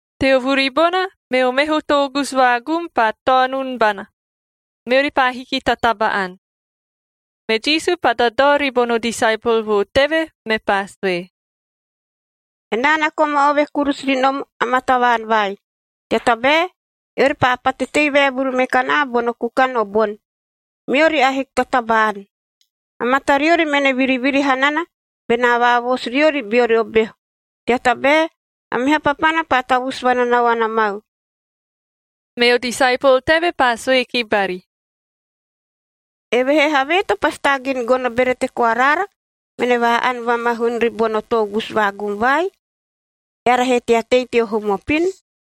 Teo vuri bona, meo meho toogusu vaagum paa taonun bana, meori paa hiki ta taba-ani. Me Jisu paa dadao ribono disaepol vo teve, mepaa sue, “Enaa na koma ove kurusu ri nom amaa tavaan vai, tea tabae eori paa pate tei vaevuru me kanaa bono kukan o boni, meori ahiki ta taba-ani. A matariori mene viriviri hanana benaa vaavoosu riori beori o behu, tea tabae a meha papana paa tavusu vananaoana mau.” Meo disaepol teve paa sue ki bari, “Evehee havee to pasi taagin gono berete koa raara mene vaa-ani vamahun ribono toogusu vaagum vai, eara he tea tei teo hum opin?”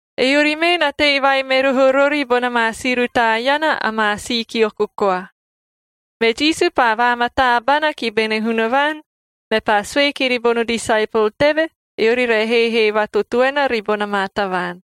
Eori mee na tei vai me roho rori bona maa si rutaa iana amaa si kioko koa. Me Jisu paa vaamataa bana ki bene Hunavaan, mepaa sue kiri bono disaepol teve, eori re heehee vatotoena ribona maa tavaan.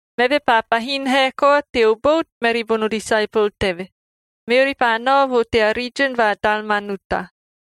Meve paa pahin hae koa teo bout meri bono disaepol teve, meori paa nao vo tea riijin va Dalmanuta.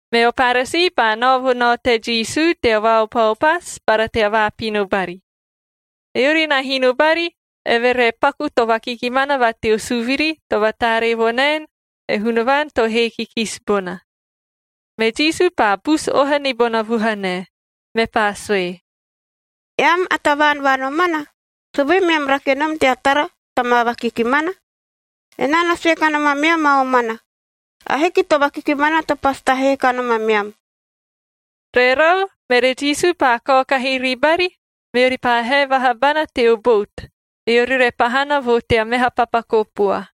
Meo Paresii paa nao vo nao te Jisu tea vaaopaopasu bara tea vaapino bari. Eori na hino bari, eve re paku to vakikimana va teo suviri to vataaree vo naen e Hunavaan to hee kikisi bona. Me Jisu paa busu oha ni bona vuhanae, mepaa sue, “Eam, a tavaan va nomana, sovee meam rake nom tea tara ta maa vakikimana? Enaa na sue kanom ameam a omana, ahiki to vakikimana to pasi tahee kanom ameam.” Rerau, mere Jisu paa kaokahi ribari, meori paa hae vaha bana teo bout, eori re pahana vo tea meha papa kopua.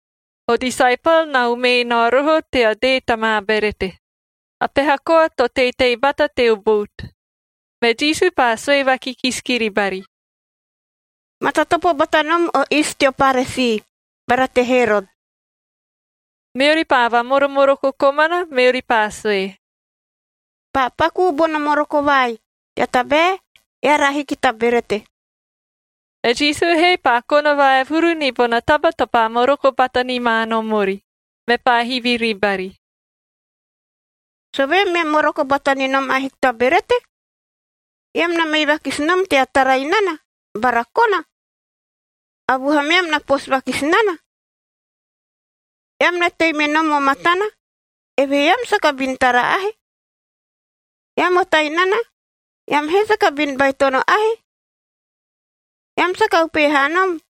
O disaepol na umee nao roho tea dee ta maa berete. A peha koa to teitei bata teo bout. Me Jisu paa sue vakikisi kiri bari, “Matatopo bata nom o iist teo Paresii bara te Herot.a” Meori paa vamoromoroko komana, meori paa sue, “Paa pakuu bono moroko vai, tea tabae eara ahiki ta berete.” E Jisu he paa kona vaevuru ni bona taba to paa moroko bata ni ma nom ori, mepaa hivi ribari, “Sovee meam moroko bata ni nom ahiki ta berete? Eam na mei vakisi nom tea tara inana bara kona? A vuhameam na poosu vakisi nana? Eam na tei me nom o matana, evehee eam saka bin tara ahe? Eam o tainana, eam he saka bin baitono ahe? Eam saka upehe haa nom,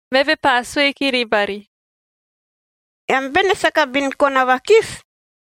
Meve paa sue kiri bari, “Eam bene saka bin kona vakisi?”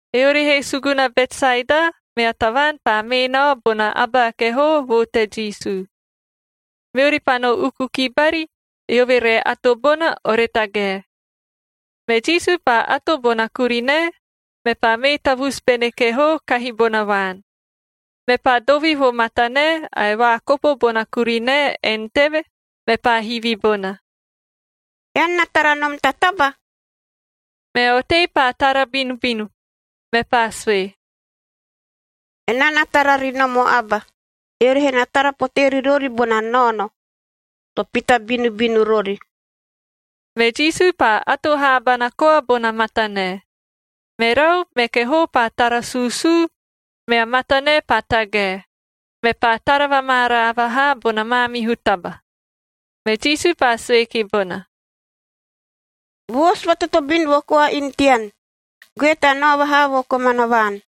Eori he suguna Betsaeda, mea tavaan paa mee nao bona aba a kehoo vo te Jisu. Meori paa no uku ki bari, eove re ato bona, ore tagae. Me Jisu paa ato bona kurinae, mepaa mee tavusu bene kehoo kahi bona vaan. Meve paa dovi vo matanae ae vaakopo bona kurinae en teve, mepaa hivi bona, “Ean na tara nom ta taba?” Mea otei paa tara binubinu, mepaa sue, “Enaa na tara ri nom o aba, eori he na tara potee ri rori bona naono to pita binubinu rori.” Me Jisu paa ato haabana koa bona matanae. Merau, me kehoo paa tara suusuu, mea matanae paa tagae, mepaa tara vamaaraa vahaa bona maamihu taba. Me Jisu paa sue ki bona, “Voosu vatotobin vo koa inu tean, goe tea nao vaha vo komana vaan.”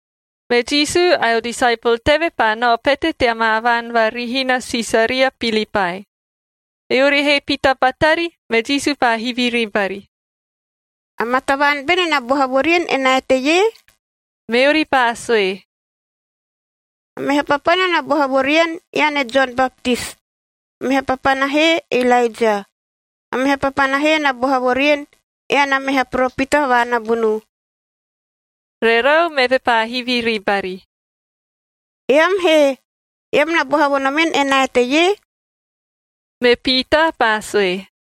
Me Jisu ae o disaepol teve paa nao pete tea maa vaan va rihina Sisaria Pilipae. Eori he pita batari, me Jisu paa hivi ribari, “Amaa tavaan bene na boha vo rien enaa eteie?” Meori paa sue, “A meha papana na boha vo rien, ean e Jon Baptis, a meha papana he e Ilaeja. A meha papana he na boha vo rien ean a meha poropita va nabunuu.” Rerau, meve paa hivi ribari, “Eam he? Eam na boha vo nomen enaa eteie?” Me Piitaa paa sue,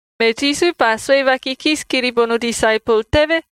Me Jisu paa sue vakikisi kiri bono disaepol teve,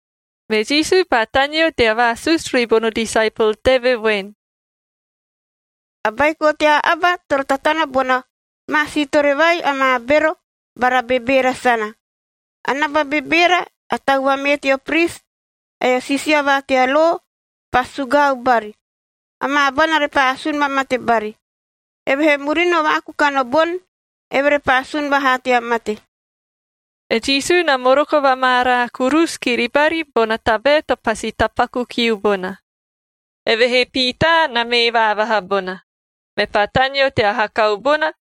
Me Jisu paa taneo tea vaasusu ribono disaepol teve voen, “A Baiko tea Aba toro tatana bona maa siitore vai amaa bero bara bebeera sana. A naba bebeera, a tau vamee teo pris, ae o siisia va tea lo pasi sugaau bari. Amaa abana repaa asun vamate bari. Evehee murino vaakukan o boni, eve repaa sun vahaa tea mate.” E Jisu na moroko vamaaraa kurusu kiri bari bona tabae to pasi tapaku kiu bona. Evehee Piitaa na mee vaavaha bona, mepaa taneo tea hakau bona,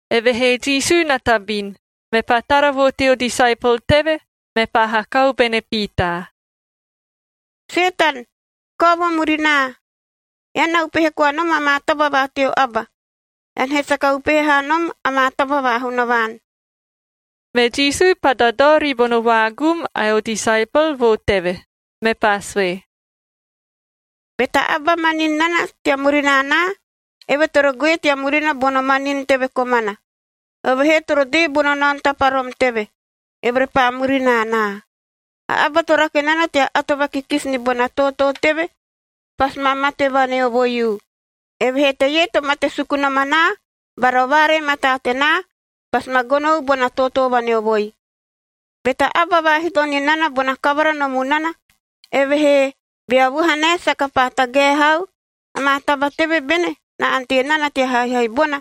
Evehee Jisu na tabin, mepaa tara vo teo disaepol teve, mepaa hakau bene Piitaa, “Setan, kao vo murinaa! Ean na upehe koa nom amaa taba va teo aba, ean he saka upehe haa nom amaa taba va Hunavaan.” Me Jisu paa dadao ribono vaagum ae o disaepol vo teve. Mepaa sue, “Be ta aba manin nana tea murina anaa, eve toro goe tea murina bono manin teve komana. Eove he toro dee bono naono taparom teve,e eove repaa murina anaa. A aba to rake nana tea ato vakikisi ni bona tootoo teve,f pasi ma mate vaneovoiu, evehee teie to mate suku nom anaa bara o vaaree mataa tenaa pasi ma gonou bona tootoo vaneovoi. Be ta aba vaahito ni nana bona kavara no munana, evehee bea vuha nae saka paa tagae hau, amaa taba teve bene na ante nana tea haihai bona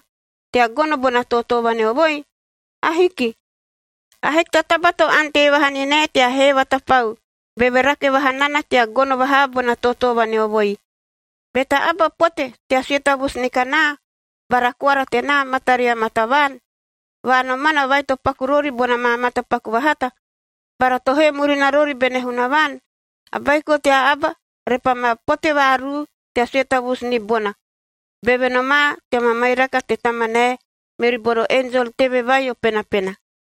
tea gono bona tootoo vaneovoi? Ahiki! Ahiki ta taba to ante vaha ni nae tea hee vatapau, beve rake vaha nana tea gono vahaa bona tootoo vaneovoi. Be ta aba pote tea sue tavusu ni kanaa bara koara tenaa mataria maa tavaan va nomana vai to paku rori bona maa matapaku vahata, bara to hee murina rori bene Hunavaan, a Baiko tea Aba repaa ma pote vaaruu tea sue tavusu ni bona, beve nomaa tea mamairaka te Tamanae meri bono enjol teve vai o penapena.”